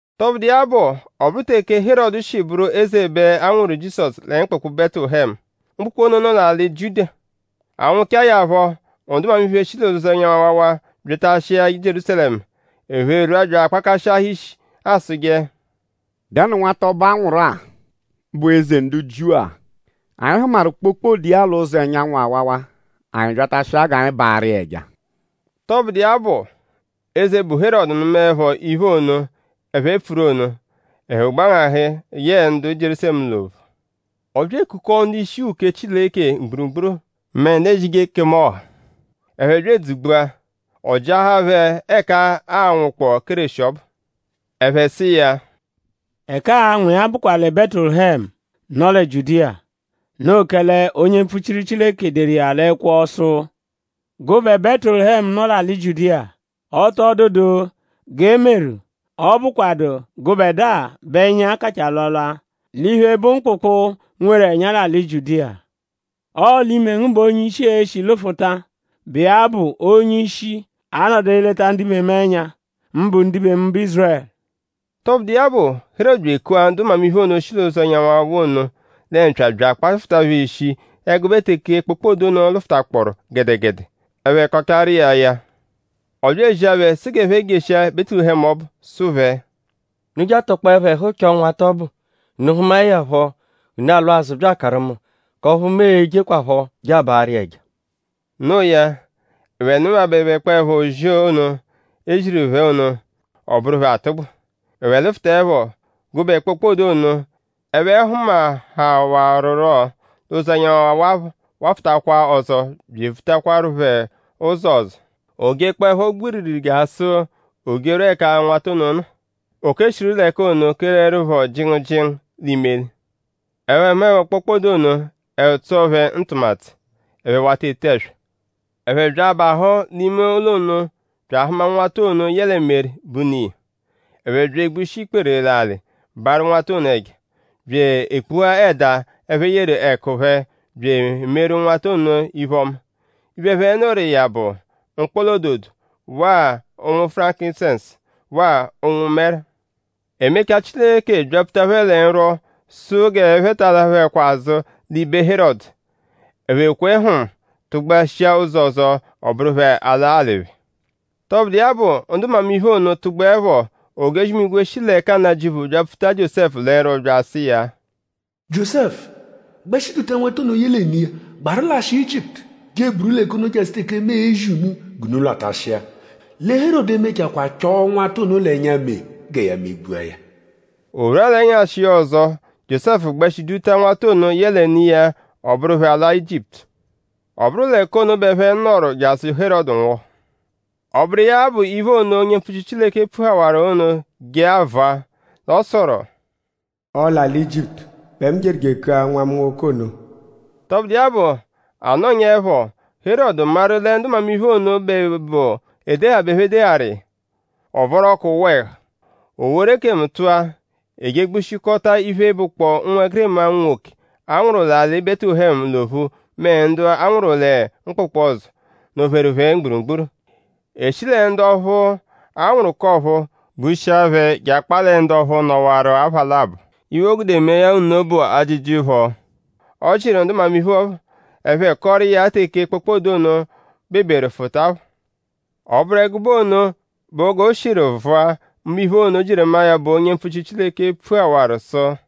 Tọbudu iya bụ; ọ bụru teke Herọdu shi bụru eze bẹ a nwụru Jizọsu lẹ mkpụkpu Bẹtulehemu. Mkpụkpu ono nọ l'alị Jiudiya. A nwụchae ya phọ; ndu mmamiphe, shi l'ụzo ẹnyanwu-awawa byatashia Jierúsalẹmu. Ẹphe rwua bya akpakashịahaa ishi asụje: “?Dẹnu nwata ọbu, a nwụru-a, bụ Eze ndu Jiu-a? Anyi hụmaru kpokpode iya l'ụzo ẹnyanwu-awawa. Anyi byatashia g'anyi baarụ iya ẹja.” Tọbudu iya bụ; eze, bụ Herọdu nụmaepho iphe ono, ẹphe pfuru ono; ẹhu gbangahụ yẹe ndu Jierúsalẹmu l'ophu. Ọ bya ekukọo ndu-ishi uke Chileke mgburugburu mẹ ndu ezije ekemu ọha. Ẹphe bya edzugbua. Ọ jịahaa phẹ ẹka aa-nwụkpoo Kéreshi ọbu. Ẹphe sụ iya: “Ẹka aa-nwụ iya bụkwa lẹ Bẹtulehemu, nọ lẹ Jiudiya. Noo kẹle onye mpfuchiru Chileke deru iya l'ẹkwo sụ: “Gụbe Bẹtulehemu, nọ l'alị Jiudiya; Ọ tọ dụdu g'e meru, ọ bụkwadu gụbedua bẹ ẹnya kachaa alwalwa l'iphe, bụ mkpụkpu, nweru ẹnya l'alị Jiudiya. Ọo l'ime ngu bẹ onye-ishi e-shi lụfuta, bụ iya bụ onye-ishi, a-nọdu eleta ndibe mu ẹnya; mbụ ndibe mu, bụ Ízurẹlu. “Tọbudu iya bụ; Herọdu bya ekua ndu mmamiphe ono, shi l'ụzo ẹnyanwu-awawa ono lẹ mpya bya akpafụta phẹ ishi ẹgube teke kpokpode ono lụfutakpooru gẹdegede. Ẹphe kọchaaru iya ya; ọ bya ezia phẹ sụ g'ẹphe jeshia Bẹtulehemu ọbu. Sụ phẹ: Unu je atọkpoepho ẹhu chọo nwata ọbu. Unu -hụmae ya phọ; unu alwa azụ bya akaru mu; k'ọphu mu e-jekwaphọ je abaarụ iya ẹja.” Noo ya; ẹphe nụmabebekpoepho ozi ono, eze ziru phẹ ono; ọ bụru phẹ atụgbu. Ẹphe lụfutaepho; gụbe kpokpode ono, ẹphe hụmahawaruro l'ụzo ẹnyanwu awawa phọ wafụtakwa ọzo bya evutakwaru phẹ phọ ụzo ọzo. O jekpọepho gbiriri jasụ o jerwua ẹka nwata ono nọ. O keshiru l'ẹka ono kelẹrupho jịngu jịngu l'imeli. Ẹphe hụmaepho kpokpode ono; ẹhu tsọo phẹ ntụmatu. Ẹphe wata ete ẹswa. Ẹphe bya abahụ l'ime ụlo ono; bya ahụma nwata ono yẹle Meri, bụ ne iya. Ẹphe bya egbushi ikpere l'alị; baarụ nwata ono ẹja; bya ekpuhaa ẹda, ẹphe yeru ẹku phẹ bya emeeru nwata ono iphe-ọma. Iphe, ẹphe nụru iya bụ; mkpọla-ododo waa ụ̀nwù furankisẹnsu; waa ụ̀nwù mẹru. E mechaa; Chileke byapfuta phẹ lẹ nrwọ sụ g'ẹphe ba alaphuẹkwa azụ l'ibe Herọdu. Ẹphe kwe hm; tụgbua shia ụzo ọzo; ọ bụru phẹ ala alị phẹ. Tọbudu iya bụ; ndu mmamiphe ono tụgbuepho; ojozi-imigwe, shi l'ẹka Nnajịuphu byapfuta Jiósẹfu lẹ nrwọ bya asụ iya: “Jiósẹfu; gbẹshi duta nwata ono yẹle ne iya gbaru lashịa Ijiputu je eburu l'ẹka ono jasụ teke mu e-zi unu g'unu lwatashịa. Lẹ Herọdu e-mechakwaa chọo nwata ono l'ẹnya mee gẹ ya megbua ya.” O rwua l'ẹnyashi iya ọzo; Jiósẹfu gbẹshi duta nwata ono yẹle ne iya; ọ bụru phẹ ala Ijiputu. Ọ bụru l'ẹka ono bẹ ẹphe nọru jasụ Herọdu nwụhu. Ọ bụru iya bụ iphe ono, onye mpfuchiru Chileke pfuhawaru ono je avụa. L'ọ sụru: “Ọo l'alị Ijiputu bẹ mu jeru je ekua nwa mu nwoke ono.” Tọbudu iya bụ; a nọnyaepho; Herọdu maru lẹ ndu mmamiphe ono bẹ bụ edeha bẹ ẹphe deharu iya. Ọ vọru ọku wụa ẹhu. O woru ekemu tụa. E je egbushikọta iphe, bụkpoo ụnwegirima unwoke, a nwụru l'alị Bẹtulehemu l'ophu mẹ ndu a nwụru lẹ mkpụkpu ọzo, nọ-pheru phẹ mgburugburu. E shi lẹ ndu ọphu, a nwụru k'ọ̀phúú gbushia phẹ je akpaa lẹ ndu ọphu nọwaru apha labọ. Iphe, o gude mee ya nno bụ ajịji phọ, ọ jịru ndu mmamiphe phọ; ẹphe kọoru iya teke kpokpode ono beberu fụta phọ. Ọ bụru ẹgube ono bụ g'o shiru vụa mbụ iphe ono, Jieremaya bụ onye mpfuchiru Chileke pfuhawaru sụ: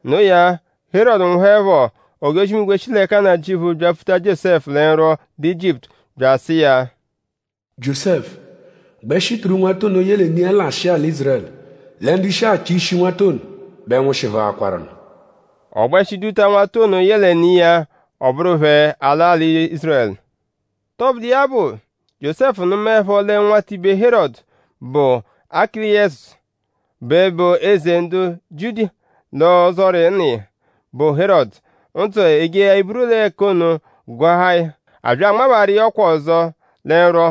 Noo ya; Herọdu nwụhuepho; ojozi-imigwe, shi l'ẹka Nnajịuphu byapfuta Jiósẹfu lẹ nrwọ lẹ Ijiputu; bya asụ iya: “Jiósẹfu; gbẹshi duru nwata ono yẹle ne iya lashịa alị Ízurẹlu; lẹ ndu shi achọ ishi nwata ono bẹ nwụshihuakwarunu.” Ọ gbẹshi duta nwata ono yẹle ne iya ọ bụru phẹ ala alị Ízurẹlu. Tọbudu iya bụ; Jiósẹfu nụmaepho lẹ nwatibe Herọdu, bụ Akileyọsu bẹ bụ eze ndu Jiudiya l'ọzori nna iya, bụ Herọdu; ndzụ eje eburu l'ẹka ono gụahaa ya. A bya anmabaaru iya ọkwa ọzo lẹ nrwọ.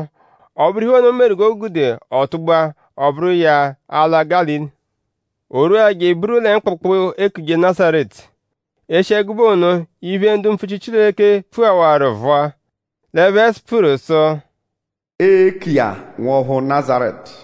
Ọ bụru iphe ono, meru g'o gude ọ tụgbua; ọ bụru iya ala Gálili. O rwua je eburu lẹ mkpụkpu, eekuje Nazaretu. E shi ẹgube ono; iphe, ndu mpfuchiru Chileke pfuhawaru vụa. L'ẹphe pfuru sụ: “Ee-ku iya Nwọphu Nazaretu.”